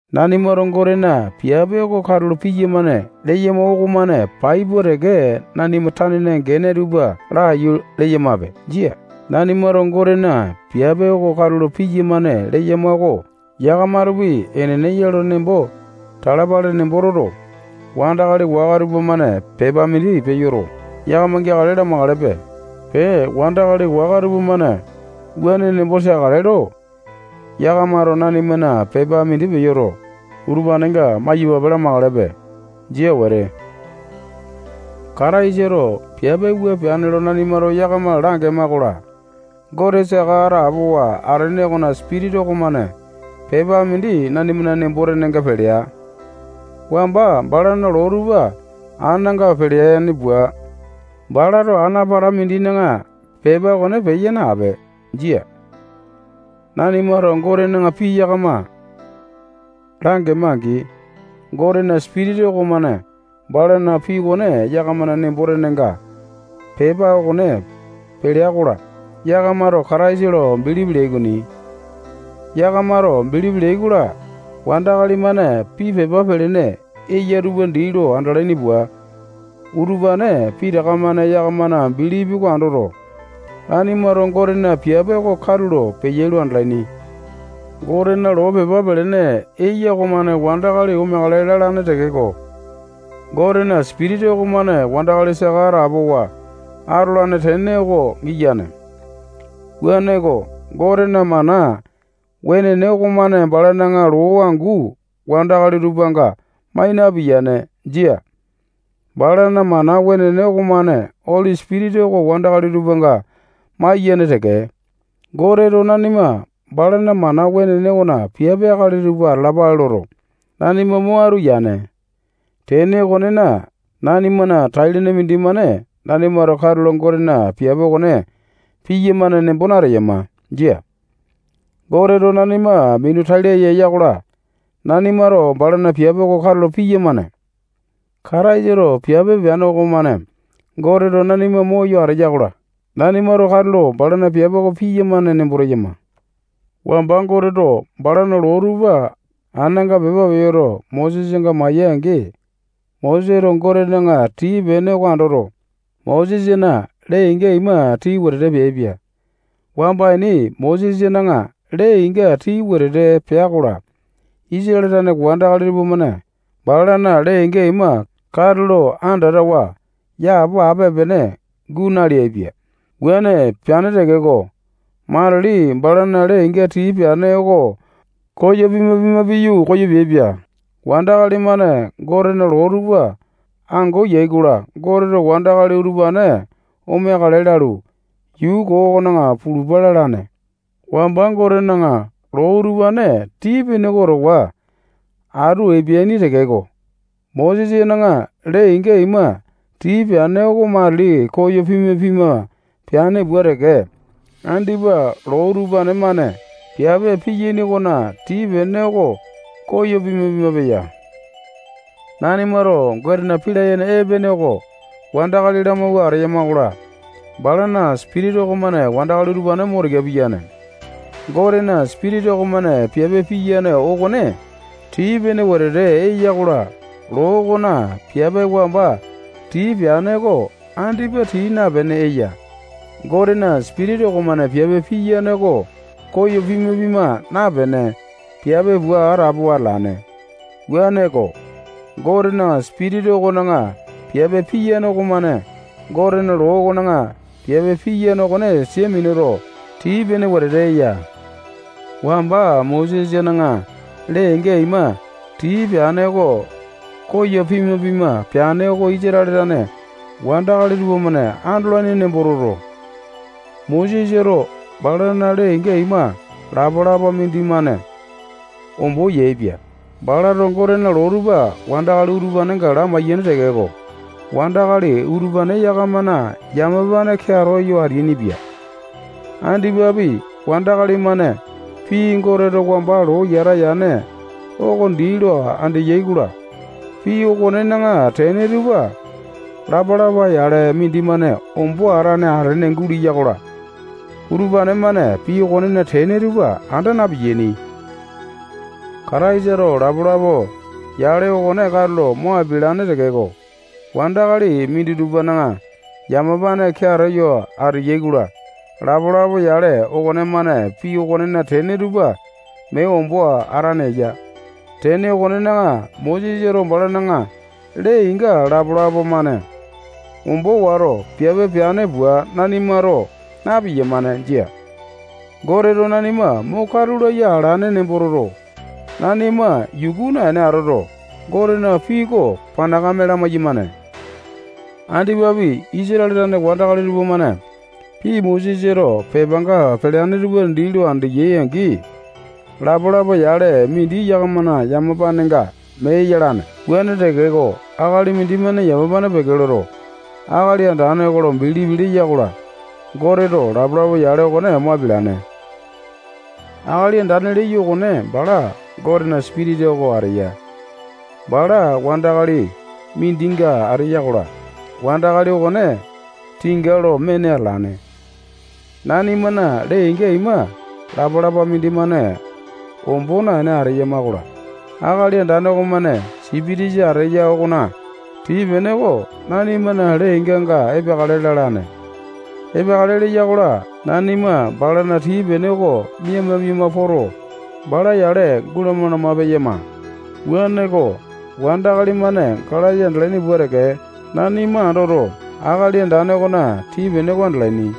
Nanimato Gotena piape oko katulo piyamane leyama okomane pai pua teke nanima tanena gene tupa laiyu leyamape. Jia. Nanimato Gotena piape oko katulo piyamane leyama oko yakamatopi enene ya lo nembo talapale nembo toto, wandakali waka tupamane pepa mindi peyoto, yakama geakale lamakalepe. Pee, wandakali waka tupamane wuane nembo teakale lo, yakamato nanimana pepa mindi peyoto, utupanenga maiyapape lamakalepe. Jia wete. Kataisato piape wua peane lo nanimato yakama langema-kola, Gote saka atapowa atene okona Sipitisa okomane pepa mindi nanimana nembo tenenga pelea. Wamba balana loo tupa ananga peleane pua, balato ana pata mindina pepa okone peya nape. Jia. Nanimato Gotena pii yakama langema-angi, Gotena Sipitisa okomane balana pii okone yakamana nembo-tenenga pepa okone pelea-kola, yakamato Kataisa lo bilipi leai okoni. Yakamato bilipi leai-kola, wandakali-mane pii pepa pelene eya tupa dii lo andalaini pua, utupane pitaka-mane yakamana bilipi oko andoto, nanimato Gotena piape oko katulo peyai lo andalaini. Gotena loo pepa pelene eya okomane wandakali omeakale lalane tekeko, Gotena Sipitisa okomane wandakali saka atapowa atolane tene oko giyane. Wuaneko, Gotena mana wenene okomane balana loo angu wandakali tupanga mai napiyane. Jia. Balana mana wenene okomane Oli Sipitisa oko wandakali tupanga maiyane teke. Goteto nanima balana mana wenene okona piape akali tupa atalapale loto, nanima mo atu yane. Tene okonena, nanimana tai-lene mindimane nanimato katulo Gotena piape okone piyamane nembo nateyama. Jia. Goteto nanima minu tai laya eya-kola, nanimato balana piape oko katulo piyamane. Kataisato piape peane okomane Goteto nanima moyo ateya-kola, nanimato katulo balana piape oko piyamane nembo teyama. Wamba Goteto balana loo tupa ananga pepa peyoto, Mosesanga maya-angi, Moseto Gotena tii-pene oko andoto, Mosesana lee-inga ima tii wetete peaipia. Wamba ini Mosesana lee-inga tii wetete pea-kola, Isatale tane wandakali tupamane balana lee-inga ima katulo andatawa yapo ape-pene guu naleaipia. Wuane peane tekeko, matili balana lee-inga tii peane oko koyo pima-pima piyu, koyo peaipia. Wandakali-mane Gotena loo tupa ango eyai-kola, Goteto wandakali utupane omeakale lalu, yuu koo okona pulupa lalane. Wamba Gotena loo utupane tii-pene oko towa atu epeaini tekeko, Mosesana lee-inga ima tii peane oko matili koyo pima-pima peane pua teke, andipa loo utupane-mane piape piyane okona tii-pene oko koyo pima-pima peya. Nanimato Gotena pii layene epene oko wandakali lamauwa ateyama-kola, balana Sipitisa okomane wandakali utupane mo tika piyane. Gotena Sipitisa okomane piape piyane okone tii-pene wetete eya-kola, loo okona piape wamba tii peane oko andipa tii napene eya. Gotena Sipitisa okomane piape piyane oko koyo pima-pima napene, piape pua atapowa atalane. Wuaneko, Gotena Sipitisa okona piape piyane okomane Gotena loo okona piape piyane okone sia minuto, tii-pene wetete eya. Wamba Mosesana lee-inga ima tii peane oko koyo pima-pima peane oko Isatale tane wandakali tupamane andolaini nembo toto, Mosesato balana lee-inga ima lapa-lapa mindimane ombo yaepia. Balato Gotena loo tupa wandakali utupanenga lamaiyane tekeko, wandakali utupane yakamana yamapane keato yo ateainipia. Andipapi, wandakali-mane pii Goteto wamba lo yata yane oko dii lo andeyai-kola, pii okonena tene tupa lapa-lapa yale mindimane ombo atane atene guleya-kola, utupane-mane pii okonena tene tupa anda na-piyaini. Kataisato lapa-lapa yale okone katulo mo apialane tekeko, wandakali minditupana yamapane keato yo ateyai-kola, lapa-lapa yale okonemane pii okonena tene tupa mee ombo atane eya. Tene okonena, Mosesato balana lee-inga lapalapa-mane ombo wato, piape peane pua nanimato na-piyamane. Jia. Goteto nanima mo katu laya alane nembo toto, nanima yuku naene atoto, Gotena pii oko panakame lamai-yamane. Andipapi, Isatale tane wandakali tupamane pii Mosesato pepanga peleane tupa dii lo andeyai-angi, lapa-lapa yale mindi yakamana yamapanenga mee yalane. Wuane tekeko, akali mindimane yamapane peke loto, Akali Andane oko lo bilipi leya-kola, Goteto lapa-lapa yale okone mo apialane. Akali Andane leyo okone bala Gotena Sipitisa oko ateya. Bala wandakali mindinga ateya-kola, wandakali okone tinga lo mene atalane. Nanimana lee-inga ima lapa-lapa mindimane ombo naene ateyama-kola, Akali Andane okomane Sipitisa ateya okona tii-pene oko nanimana lee-inganga epeakale lalane. Epeakale leya-kola, nanima balana tii-pene oko miama-miama poto, bala yale gulama-lama peyama. Wuaneko, wandakali-mane galasa andalaini pua teke, nanima andoto, Akali Andane okona tii-pene oko andalaini.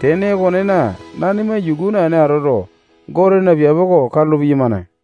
Tene okonena, nanima yuku naene atoto, Gotena piape oko katulo piyamane.